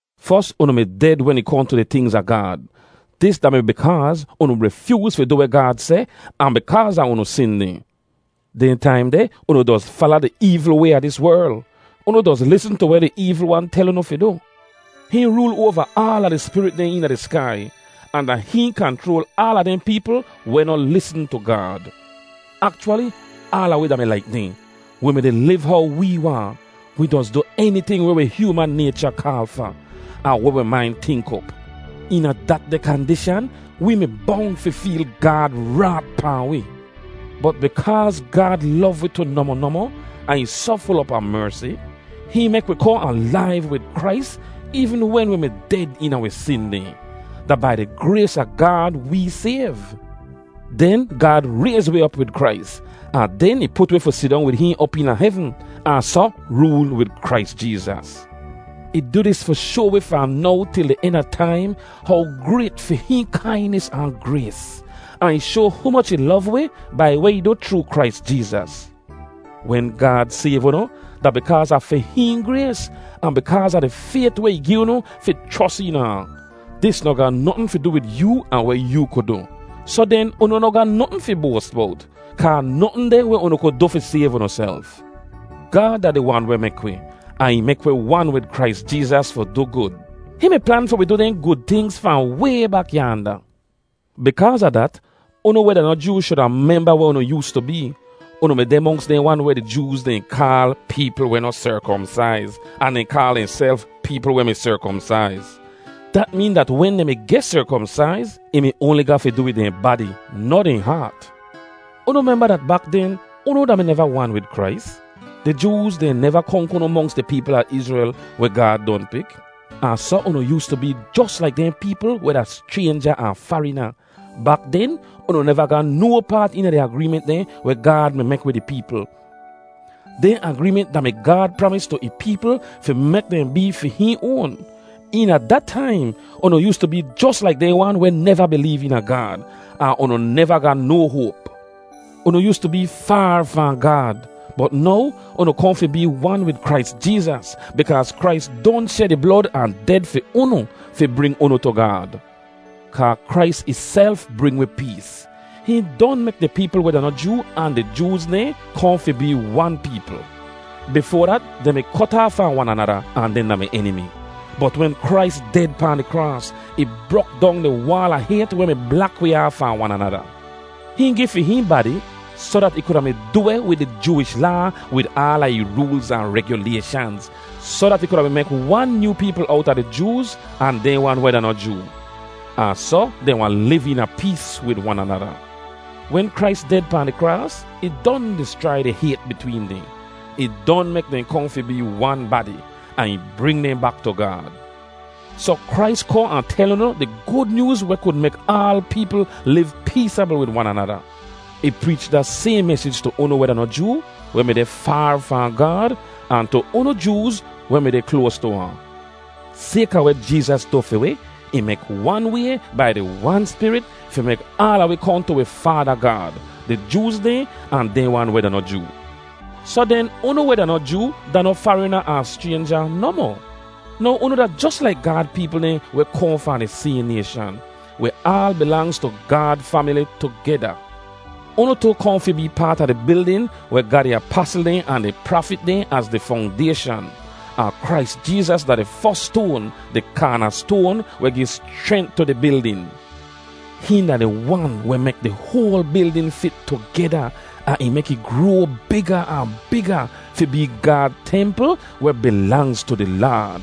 Fos, unu mi ded wen ih kohn tu di tingz a Gaad. Dis da-mi bikaaz unu rifyooz fi du weh Gaad seh ahn bikaaz a unu sin dehn. Dehn taim deh unu doz fala di eevl way a dis werl. Unu doz lisn tu weh di eevl wan tel unu fi du. Hihn rool oava aala di spirit dehn eena di skai, ahn da hihn kanchroal aala dehn peepl weh noh lisn tu Gaad. Akchwali aala wi da-mi laik dehn; wi mi-di liv how wee waahn. Wi doz du eniting weh wi hyooman naycha kaal fa, ahn weh wi main tink op. Eena datdeh kandishan, wee mi bong fi feel Gaad raat pahn wi. Bot bikaaz Gaad lov wi tu nohmoh nohmoh ahn ih soh ful op a mersi, hihn mek wi kohn alaiv wid Krais eevn wen wi mi ded eena wi sin dehn. Da bai di grays a Gaad wee sayv! Den Gaad rayz wi op wid Krais, ahn den ih put wi fi sidong wid hihn op eena hevn, ahn soh rool wid Krais Jeezas. Ih du dis fi shoa wi fahn now til di en a taim how grayt fi hihn kainis ahn grays; ahn ih shoa humoch ih lov wi bai weh ih du chroo Krais Jeezas. Wen Gaad sayv unu, da bikaaz a fi hihn grays, ahn bikaaz a di fayt weh ih gi unu fi chros eena ahn. Dis noh ga notn fi du wid yoo ahn weh yoo ku du. Soh den, unu noh ga notn fi boas bowt, kaa notn deh weh unu kud du fi sayv unuself. Gaad da di Wan weh mek wi, ahn ih mek wi wan wid Krais Jeezas fi du gud. Hihn mi plan fi wi du dehn gud tingz fahn way bak yaanda. Bikaaz a dat, unu weh da noh Joo shuda memba weh unu yoostu bee. Unu mi deh monks dehn wan weh di Jooz dehn kaal “peepl weh noh serkomsaiz,” ahn dehn kaal dehnself “peepl weh mi serkomsaiz.” (Dat meen dat wen dehn mi geh serkomsaiz, ih mi oanli ga fi du wid dehn badi, noh dehn haat.) Unu memba dat bak den, unu da-mi neva wan wid Krais. Di Jooz dehn neva konk unu monks di peepl a Izrel weh Gaad don pik. Ahn soh unu yoostu bee jos laik dehn peepl weh da schraynja ahn farina. Bak den, unu neva ga no paat eena di agreement dehn weh Gaad mi mek wid ih peepl. Dehn agreement da-mi Gaad pramis tu ih peepl fi mek dehn bee fi hihn oan. Eena da taim, unu yoostu bee jos laik dehn wan weh neva bileev eena Gaad, ahn unu neva ga no hoap. Unu yoostu bee faar fahn Gaad. Bot now unu kohn fi bee wan wid Krais Jeezas, bikaaz Krais don shed ih blod ahn ded fi unu fi bring unu tu Gaad. Kaa Krais ihself bring wi pees. Hihn don mek di peepl weh da noh Joo ahn di Jooz dehn kohn fi bee wan peepl. Bifoa dat, dehn mi kot aaf fahn wan anada ahn dehn da-mi enimi. Bot wen Krais ded pahn di kraas, ih brok dong di waal a hayt weh mi blak wi aaf fahn wan anada. Hihn gi fi hihn badi soh dat ih kuda mi du weh wid di Jooish Laa wid aala ih roolz ahn regulayshanz, soh dat ih kuda mi mek wan nyoo peepl owta di Jooz, ahn dehn wan weh da noh Joo, ahn soh dehn wahn liv eena pees wid wan anada. Wen Krais ded pahn di kraas, ih don dischrai di hayt bitween dehn. Ih don mek dehn kohn fi bee wan badi, ahn ih bring dehn bak tu Gaad. Soh Krais kohn ahn tel unu di Gud Nyooz weh kud mek aal peepl liv peesabl wid wan anada. Ih preech da sayhn mesij tu unu weh da noh Joo, weh mi deh faar fahn Gaad, ahn tu unu Jooz weh mi deh kloas tu ahn. Sayka weh Jeezas du fi wi, ih mek wan way bai di Wan Spirit fi mek aala wi kohn tu wi Faada Gaad, di Jooz dehn ahn dehn wan weh da noh Joo. Soh den, unu weh da noh Joo da noh farina ahn schraynja nohmoh. Now unu da jos laik Gaad peepl dehn weh kohn fahn di sayhn nayshan. Wi aal bilangz tu Gaad famili tugeda. Unu tu kohn fi bee paat a di bildin weh ga di apasl dehn ahn di prafit dehn az di fongdayshan. Ahn Krais Jeezas da di fos stoan, di kaanastoan, weh gi schrent tu di bildin. Hihn da di Wan weh mek di hoal bildin fit tugeda ahn ih mek ih groa biga ahn biga fi bee Gaad templ weh bilangz tu di Laad.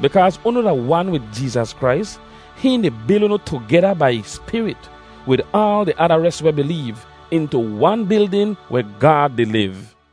Bikaaz unu da wan wid Jeezas Krais, hihn di bil unu tugeda bai ih Spirit, wid aal di ada res weh bileev, intu wan bildin weh Gaad di liv.